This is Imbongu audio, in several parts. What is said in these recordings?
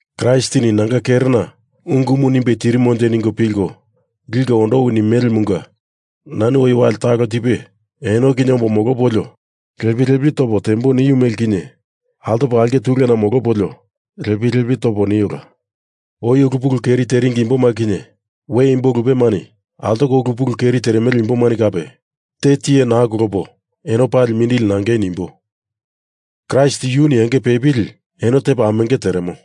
Kraistini nanga kerena ungumu nimbe tirimonje ningo pilko liko ondowi nimelemunga nani oi wali talo tipe eno kinye ombo molopolio lepi lepi topo tembo niu mele kinye altopo aulke tulena molopolio lepi lepi topo niola. Oi ulu pulu keri teringi imboma kinye, we imbo lupemani altoko ulu pulu keri teremele imboma kape, te tiye naa kolopo eno pali mindili nangei nimbo. Kraist yuni enge pepili eno tepa amenge teremo.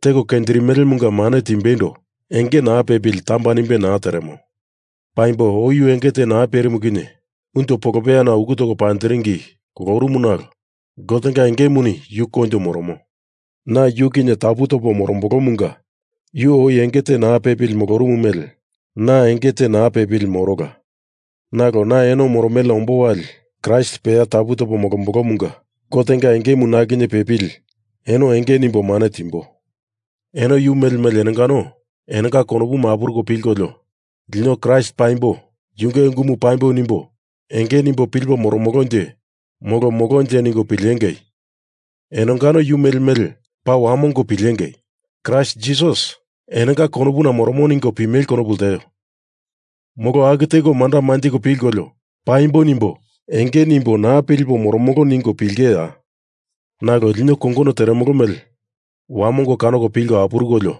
Teko kenjirimelemunga mane timbeindo enge naa pepili tamba nimbe naa teremo. Paimbo oi yu enge te naa perimu kinye unjo polopeyana uku toko panjiringi kolorumu nalo Gotenga engemuni yu koinjo moromo. Na yu kinye tapu topo morombolomunga yu oi enge te naa pepili molorumu mele na enge te naa pepili morola, nalo na eno moromelena ombo wali Kraist peya tapu topo molombolomunga Gotenga engemu na kinye pepili eno enge nimbo mane timbo. Eno yu mele mele enongano enonga konopuma apuruko pilkolio, lino Kraist paimbo, Yunge ungumu paimbo nimbo enge nimbo pilipo moromolonje molo molonje ningo pilengei! Enongano yu mele mele paa wamongo pilengei! Kraist Jisas enonga konopuna moromo ningo pimele konopu lteo. Molo aku teko manda manjiko pilkolio paimbo nimbo enge nimbo naa pilipo moromolo ningo pilengeiya? Nalo lino kongono teremolo mele wamongo kanoko pilko apurukolio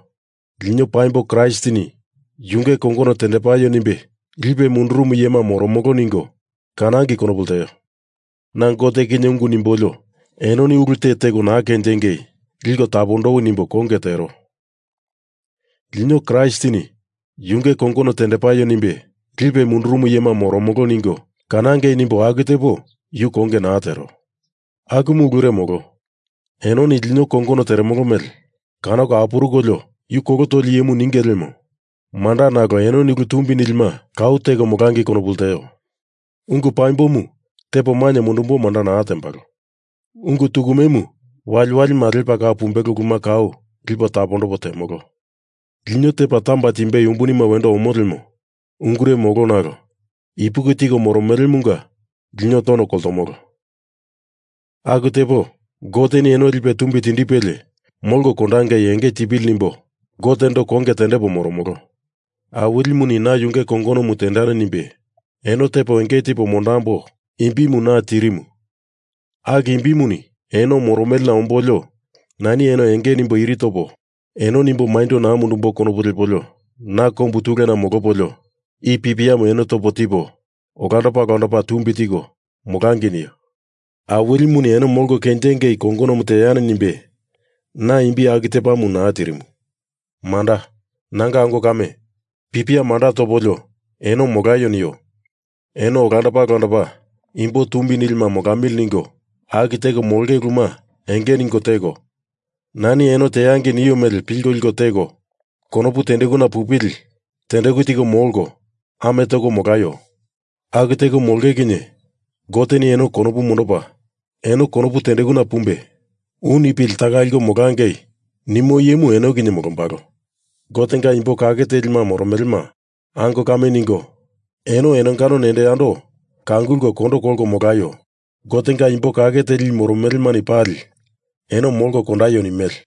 lino paimbo Kraistini Yunge kongono tendepaio nimbe lipe mundurumu iyema moromolo ningo kanangei konopu lteo. Na Gote kinye ungu nimbolio, enoni ulu te teko naa kenjingei liko tapondowi nimbo konge tero. Lino Kraistini Yunge kongono tendepaio nimbe lipe mundurumu iyema moromolo ningo kanangei nimbo aku tepo yu konge naa tero. Akumu ulure molo. Enoni lino kongono teremolo mele kanoko apurukolio yu kolo toli iyemu ninge lemo manda nalo enoni ulu tumbi nilima kau teko molangei konopu lteo. Ungu paimbomu tepo mainye mundumbo manda naa temolo. Ungu tukumemu waliwalima lepa kau pumbelo uluma kau lipo tapondopo temolo. Lino tepa tamba timbei umbunima wendo omo lemo ungure molo nalo ipuki tiko moromelemunga lino tono koltomolo. Aku tepo Goteni eno lipe tumbi tindipelie molko kondangei enge tipili nimbo Gotendo konge tendepo moromolo. Awilimuni na yunge kongonomu tendani nimbe eno tepo enge tipo mondambo imbimu na tirimu aku imbimuni eno moromelena ombolio nani eno enge nimbo iri topo eno nimbo maindo naa mundembo konopu lepolio na kombu tulena molopolio i pipiamu eno topo tipo olandopa olandopa tumbi tiko molangei nio. Awilimuni eno molko kenjingei kongonomu teani nimbe na imbi aku tepamu naa tirimu. Manda, nanga ango kame, pipia manda topolio eno molaio nio. Eno olandopa olandopa imbo tumbi nilima molamili ningo aku teko molonge uluma enge ningo teko, nani eno teangei nio mele pilko liko teko, konopu tendekuna pupili tendeku tiko molko, ame toko molaio. Aku teko molonge kinye Goteni eno konopu mondopa, eno konopu tendekuna pumbe u nipili taka liko molangei nimo iyemu eno kinye molombalo. Gotenga imbo kake telima moromelema ango kame ningo eno enongano nendo yando kangulko kondo kolko molaio. Gotenga imbo kake teli i moromelemani pali eno molko kondaio nimele.